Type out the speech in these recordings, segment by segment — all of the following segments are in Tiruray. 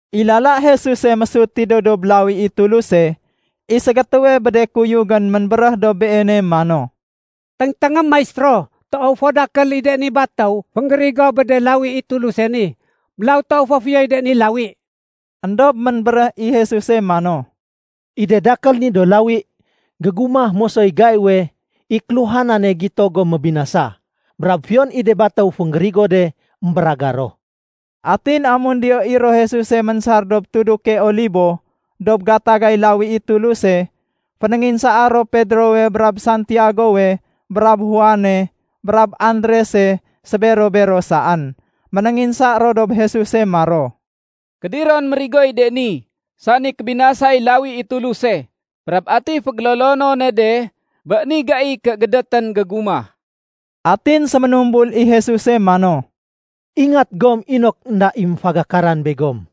I lala Jesuse mésut tidéw dob lawi i Tuluse, i ségétéwe bé de kuyugén ménbéréh dob Beene mano, “Téngténgém, Maistéro. Toow fo dakél i de ni batéw fénggérigo bé de lawi i Tuluse ni, mélaw toow fo fiyoy de ni lawi.” Endob ménbéréh i Jesuse mano, “I de dakél ni do lawi, gégumah mosoy gaiwe i kéluhanane gito gom mébinasa. Brab fiyon i de batéw fénggérigo de, émbéragar ro.” Atin amun diyo i ro Jesuse ménsar dob Tuduke Olibo, dob gatagay lawi i Tuluse, fénénginsaa ro Pedrowe brab Santiagowe brab Juane brab Andrese sébero-bero saén. Ménénginsa ro dob Jesuse maro, “Kédiron mérigoy de ni, sani kébinasay lawi i Tuluse? Brab ati fégélolonone de bé ni gai ké gédétén gégumah?” Atin séménumbul i Jesuse mano, “Ingat gom inok énda i méfagakaran begom.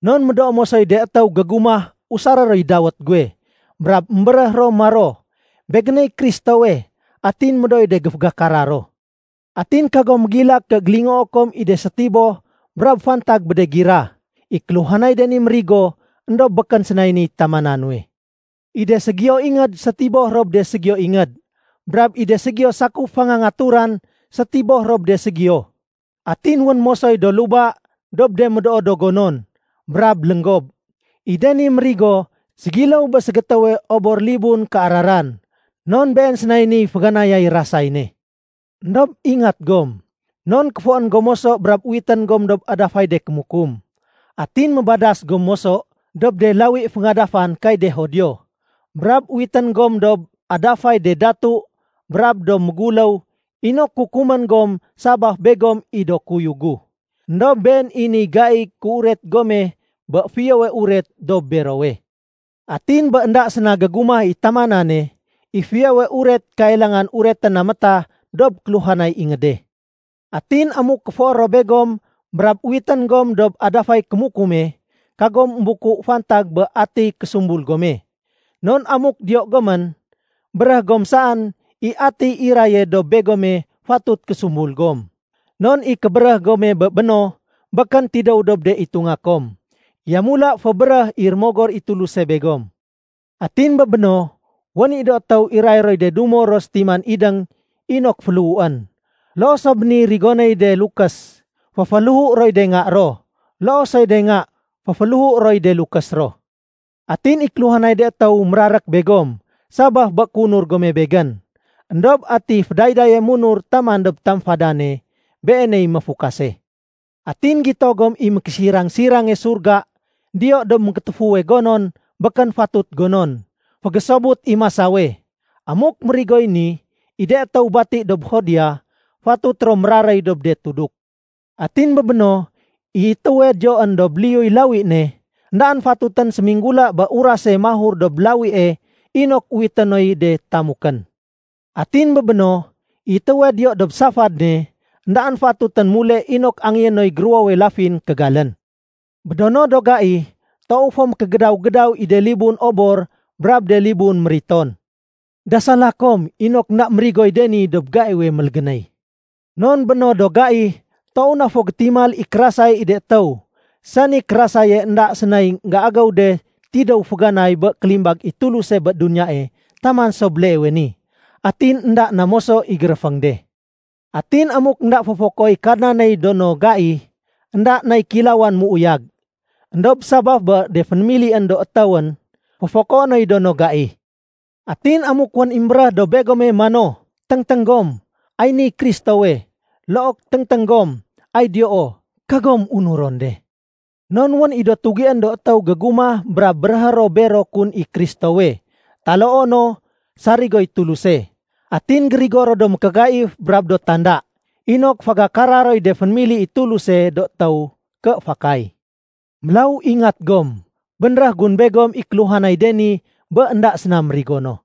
Non médoo mosoy de étéw gégumah usaré roy dawét guwe, brab émbéréh ro maro, ‘Begéney Kristowe’. Atin médooy de géfagakara ro. Atin kagom mégilak ké gélingoo kom i de sétiboh brab fantag bé de gira. I kéluhanay de ni mérigo, éndob békén sénay niy tamana nuwe. I de ségiyo ingéd sétiboh ro bé de ségiyo ingéd. Brab i de ségiyo sakuf fangangaturan sétiboh ro bé de ségiyo. Atin wén mosoy do luba dob de médoo do gonon, brab lénggob. I de ni mérigo ségiléw bé ségétéwe obor libun kéararan non been sénay niy féganayay rasay ne. “Endob ingat gom, non kéfoén gom moso brab uwitén gom dob adafay de kémukum. Atin mébadas gom moso dob de lawi féngadafan kay de Judio. Brab uwitén gom dob adafay de datu brab do méguléw inok kukumén gom sabaf begom i do kuyug gu. Endob been i niy gaiy kéuret gome bé Fiyowe Uret dob berowe. Atin bé énda séna gégumah i tamanane, i Fiyowe Uret kailangan uretén na métah dob kéluhanay ingéde. Atin amuk kéfoé ro begom brab uwitén gom dob adafay kémukume, kagom émbuku fantag bé atiy késumbul gome. Non amuk diyo gomén, béréh gom saén i atiy iraye dob begome fatut késumbul gom. Non i kébéréh gome bé béno, békén tidéw dob de itunga kom. Yamula fébéréh i Rémogor i Tuluse begom. Atin bé béno, wén i do étéw iray roy de dumo ro sétiman idéng inok féléhuén. Loo so bé niy rigonéy de lukés, féféléhu roy de nga ro. Loo soy de nga féféléhu roy de lukés ro. Atin i kéluhanay de étéw mérarék begom sabaf bé kéunur gome Begén, éndob ati fédaydaye munur taman dob tamfadane, beeney méfukase. “Atin gito gom i ‘Mékésirang-sirange Surga’ diyo dob mékétéfuwe gonon békén fatut gonon. (Fégésobut i masawe.) Amuk mérigoy ni, i de étéw bati dob Judea, fatut ro méraréy dob de tuduk. Atin bé béno, i étéwe diyoén dob liyuy lawi ne, éndaén fatutén séminggula bé urase mahur dob lawie inok uwité noy de tamukén. Atin bé béno, i étéwe diyo dob safad ne, éndaén fatutén mule inok angéyé noy géruwowe lafin kégalén. Bé do no do gai, toow fo mékégédaw-gédaw i de libun obor brab de libun mériton. Dasala kom inok énda mérigoy de ni dob gaiwe mélégénéy. Non bé no do gai, toow na fo gétimal i kérasay i de étéw, sani kérasaye énda sénay énggéagéw de tidéw féganay bé kélimbag i Tuluse bé duniyae taman so béleewe ni. Atin énda na moso i géréféng de. Atin amuk énda féfokoéy Kadnaney do no gai, énda nay kéilawan méuyag. Endob sabaf bé de fénémilién do étéwén, féfokoé noy do no gai. “Atin amuk wén i émbéréh dob begome mano, ‘Téngténg gom, ay niy Kristowe!’ look ‘Téngténg gom, ay diyoo!’ kagom unuron de. Non wén i do tugién do étéw gégumah brab béréhé ro bero kun i Kristowe taloo no sarigoy Tuluse. Atin gérigo ro do mékégaif brab do tanda, inok fégakara roy de fénémili i Tuluse do étéw ké fakay. Mélaw ingat gom. Bénréh gun begom i kéluhanay de ni bé énda séna mérigo no.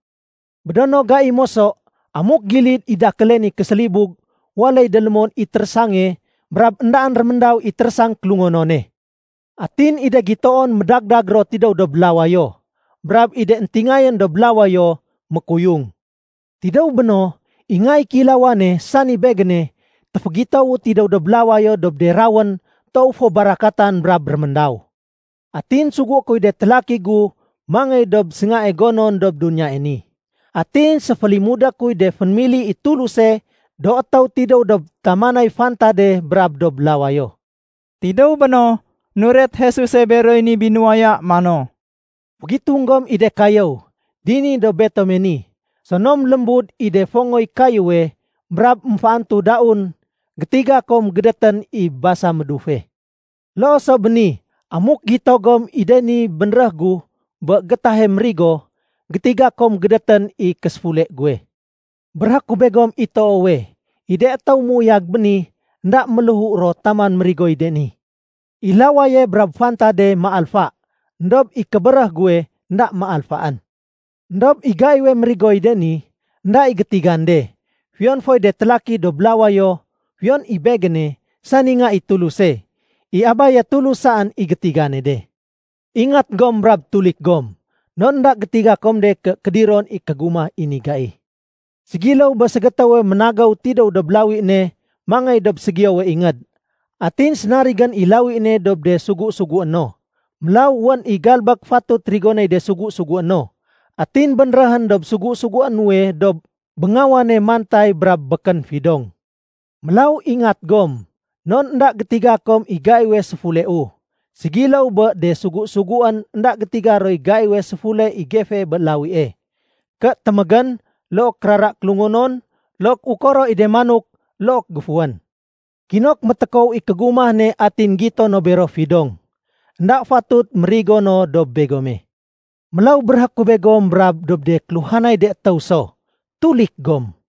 “Bé do no gai moso, amuk gilid i dakéle ni késélibug, waléy délémon i térésange brab éndaén réméndaw i térésang kélungonone. Atin i de gitoon médagdag ro tidéw dob lawayo, brab i de éntingayén dob lawayo mékuyung. Tidéw béno, i Nga i Kéilawane, sani Begéne, téfégitowu tidéw dob lawayo dob de rawén toow fo barakatan brab réméndaw. Atin sugué kuy de télaki gu mangéy dob séngae gonon dob duniyae ni. Atin séfélimudé kuy de fénémili i Tuluse do étéw tidéw dob tamanay fantade brab dob lawayo.” Tidéw béno, nuret Jesuse beroy ni binuwaya mano, “Fégitung gom i de kayéw. Dini dob betome ni, sonom lémbud i de fongoy kayéwe brab émféantu daun, gétiga kom gédétén i basa médufe. Loo so bé ni amuk gito gom i de ni bénréh gu bé gétahe mérigo, gétiga kom gédétén i késéfule guwe. Béréhé ku begom i toowe, i de étéw méuyag béni, énda méléhu ro taman mérigoy de ni. I lawaye brab fantade méalfa, éndob i kébéréh guwe énda méalfaén. “Endob i gaiwe mérigoy de ni, énda i gétigan de, fiyon foy de télaki dob lawayo, fiyon i Begéne, sani Nga i Tuluse. I Abaye Tulus saén i gétigane de. Ingat gom, brab tulik gom, non énda gétiga kom de ké kédiron i kégumah i ni gai. Ségiléw bé ségétéwe ménagéw tidéw dob lawi ne mangéy dob ségiyowe ingéd. Atin sénarigén i lawi ne dob de sugu-sugué no. Mélaw wén i galbék fatut rigonéy de sugu-sugué no. Atin bénréhén dob sugu-sugué nuwe dob béngawane mantay brab békén fidong. Mélaw ingat gom, non énda gétiga kom i gaiwe séfuleu, ségiléw bé de sugu-suguén énda gétiga roy gaiwe séfule i gefee bé lawie, ké témégén, look kérara kélungonon, look ukoro i de manok, look géfuwén. Kinok métékow i kégumah ne atin gito no bero fidong. Enda fatut mérigo no dob begome. Mélaw béréhé ku begom brab dob de kéluhanay de étéw so: Tulik gom.”